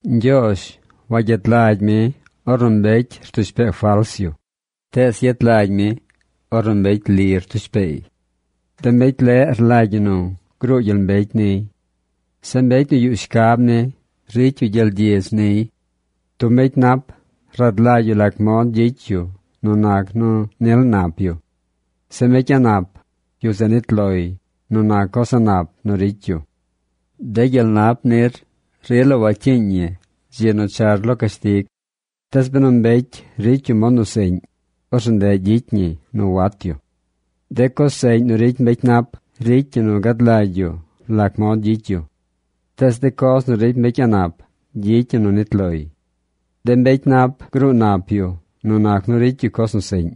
Ñgyoozh wagyet lagy mi ornu mbecy rtush pee fals yu, tees yet lagy mi ornu mbecy tush pee liy. De mbecy leꞌ rlagy ñi nu gruu gyel mbecy niy. Zeꞌ mbecy nu yuꞌ shcab ni ricy yu gyel gyidz niy. Tub mbecy nap rad lagy yu lac mod gyicy yu nu nac nu nil nap yu. Zeꞌ mbecy a̱ꞌ nap, yu zeꞌ nit loy nu nac coz a̱ꞌ nap nu ricy yu. De gyel nap nir, rila wacyiiñ ñi dzi nu char lo cashtig. Tees benu mbecy ricy yu mod nu seꞌñ, orzeꞌ ndeꞌ gyicy ñi nu wat yu. De coz seꞌñ nu ricy mbecy nap ricy ñi nu gad lagy yu lac mod gyicy yu. Tees de coz nu ricy mbecy a̱ꞌ nap gyicy ñi nu nit loy. De mbecy nap gruu nap yu nu nac nu ricy yu coz nu seꞌñ.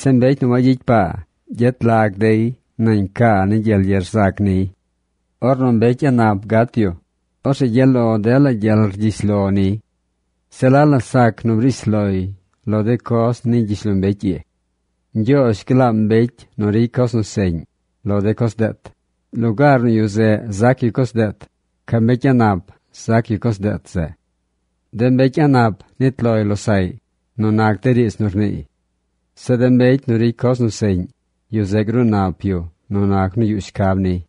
Zeꞌ mbecy nu wayicy paa gyet lag dey nañ caa ni gyel ye rzac niy. Ornu mbecy a̱ꞌ nap gat yu, orzeꞌ gyaꞌ lo dela gyel rgyish lo niy. Se la la sac nu briish loy lo de coz ni gyishlombecy ii. Ñgyoozh glaam mbecy nu ricy coz nu seꞌñ lo de coz deet. Lugaar nu yu zeꞌ zac yu coz deet, ca mbecy a̱ꞌ nap zac yu coz deet zeꞌ. De mbecy a̱ꞌ nap nit loy losaꞌy nu nac de riidz nu rniiy. Zeꞌ de mbecy nu ricy coz nu seꞌñ, yu zeꞌ gruu nap yu nu nac nu yuꞌ shcab niy.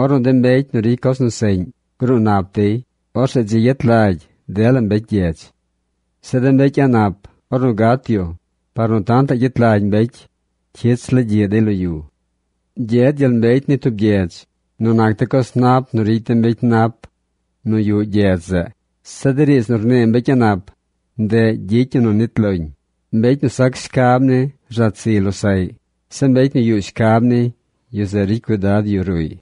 Ornu de mbecy nu ricy coz nu seꞌñ gruu nap dey, orzeꞌ dzi yet lagy dela mbecy gyedz. Zeꞌ de mbecy a̱ꞌ nap, ornu gat yu, par nu tantaꞌ gyet lagy mbecy, cyich la gyiꞌ dey lo yu. Gyed gyel mbecy ni tub gyedz nu nac de coz nap nu ricy de mbecy nap nu yuꞌ gyedz zeꞌ. Zeꞌ de riidz nu rnii mbecy a̱ꞌ nap, ndeꞌ gyicy ñi nu nit loñ. Mbecy nu sac shcab ni rzat ziy losaꞌy. Zeꞌ mbecy nu yuꞌ shcab ni, yu zeꞌ ricy cuidad yu ruꞌy.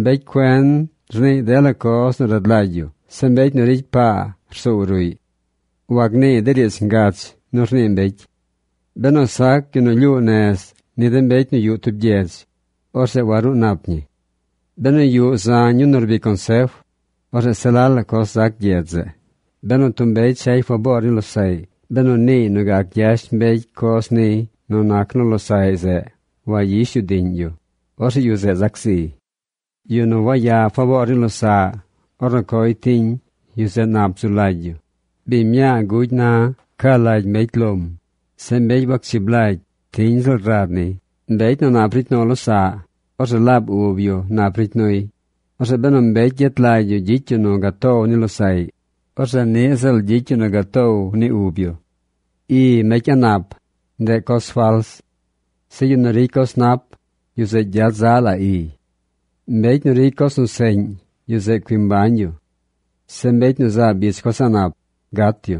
Mbecy cuen rniiy dela coz nu rad lagy yu. Zeꞌ mbecy nu ricy paa rsoow ruꞌy. Wagniiy de riidz ngach nu rnii mbecy. Benu sac yu nu lyuu nez ni de mbecy nu yuꞌ tub gyedz, orzeꞌ waruu nap ñi. Benu yuꞌ zañ yu nu rbic consef, orzeꞌ se la la coz zac gyedz zeꞌ. Benu tub mbecy chay faboor ni losaꞌy, benu niiy nu gac gyash mbecy coz niy nu nac nu losaꞌy zeꞌ wayish yu diꞌñ yu, orzeꞌ yu zeꞌ zac ziy. Yu nu waya faboor ni losaꞌ ornu coy tiñ, yu zeꞌ nap zu lagy yu. Biñ mñaa gugy, na ca lagy mbecy lom. Zeꞌ mbecy wachib lagy, tiñ ziꞌl rad niy. Mbecy nu nap ricy nu losaꞌ, orzeꞌ laab ub yu nap ricy nuy. Orzeꞌ benu mbecy yet lagy yu gyicy yu nu gatow ni losaꞌy, orzeꞌ niꞌ ziꞌl gyicy yu nu gatow ni ub yu. I mbecy a̱ꞌ nap, ndeꞌ coz fals. Zeꞌ yu nu ricy coz nap, yu zeꞌ gyad zaꞌ la iy. Mbecy nu ricy coz nu seꞌñ, yu zeꞌ cui mbañ yu. Zeꞌ mbecy nu zaab ich coz a̱ꞌ nap gat yu.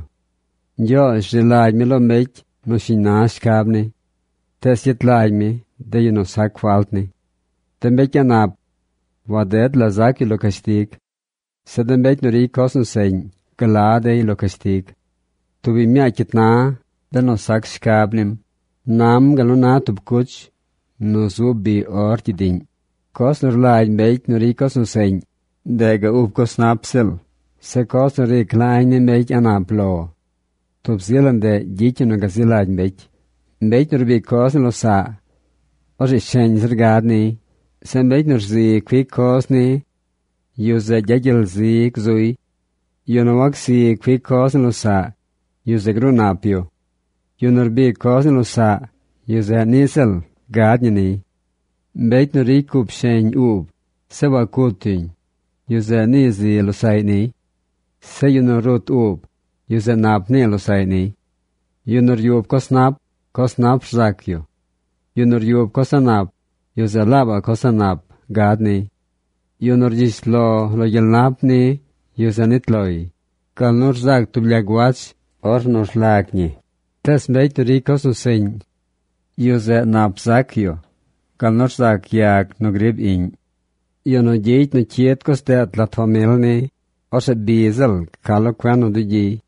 Ñgyoozh rzi lagy mi lo mbecy nu shiñ na shcab ni. Tees yet lagy mi de yu nu sac falt ni. De mbecy a̱ꞌ nap waded la zac yu lo cashtig. Zeꞌ de mbecy nu ricy coz nu seꞌñ gla dey lo cashtig. Tub biñ mñaa cyit na, benu sac shcab nim, nam gal nu na tub cuch nu zub biꞌ or gyidiꞌñ. Coz nu rlagy mbecy nu ricy coz nu seꞌñ, ndeꞌ du ub coz nap ziꞌl. Zeꞌ coz nu ric la añ ni mbecy a̱ꞌ nap lo, tub zi la ndeꞌ gyicy ñi nu gazi lagy mbecy. Mbecy nu rbic coz ni losaꞌ, orzeꞌ sheñ zir gad niy. Zeꞌ mbecy nu rzi cuic coz ni, yu zeꞌ gyagyel zi zuy. Yu nu wacsi cuic coz ni losaꞌ, yu zeꞌ gruu nap yu. Yu nu rbic coz ni losaꞌ, yu zeꞌ niꞌ ziꞌl gad ñi niy. Mbecy nu ricy cup sheñ uub, zeꞌ wacut yuñ, yu zeꞌ nii zi losaꞌy niy. Zeꞌ yu nu rut uub, yu zeꞌ nap nii losaꞌy niy. Yu nu ryub coz nap, coz nap rzac yu. Yu nu ryub coz a̱ꞌ nap, yu zeꞌ laabaꞌ coz a̱ꞌ nap gad niy. Yu nu rgyish lo lo gyel nap ni, yu zeꞌ nit loy gal nu rzac tub lyag wach ornu rlag ñi. Tees mbecy nu ricy coz nu seꞌñ, yu zeꞌ nap zac yu gal nu rzac yag nu grib iꞌñ. Yu nu gyicy nu cyid coz deet lat famil ni, orzeꞌ bi ziꞌl ca lo cuen nu dugyiy.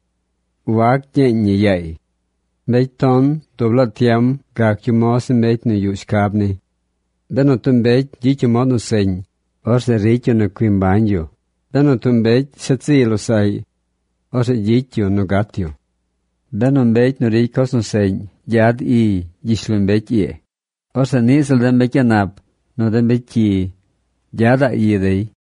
Wac gyeeñ ñi yaay. Mbecy ton dub laa tiem gac yu moz ni mbecy nu yuꞌ shcab ni. Benu tub mbecy gyicy yu mod nu seꞌñ, orzeꞌ ricy yu nu cui mbañ yu. Benu tub mbecy shet ziy losaꞌy, orzeꞌ gyicy yu nu gat yu. Benu mbecy nu ricy coz nu seꞌñ gyad iy gyishlombecy ii, orzeꞌ niꞌ ziꞌl de mbecy a̱ꞌ nap nu de mbecy cyi gyadaꞌ i dey.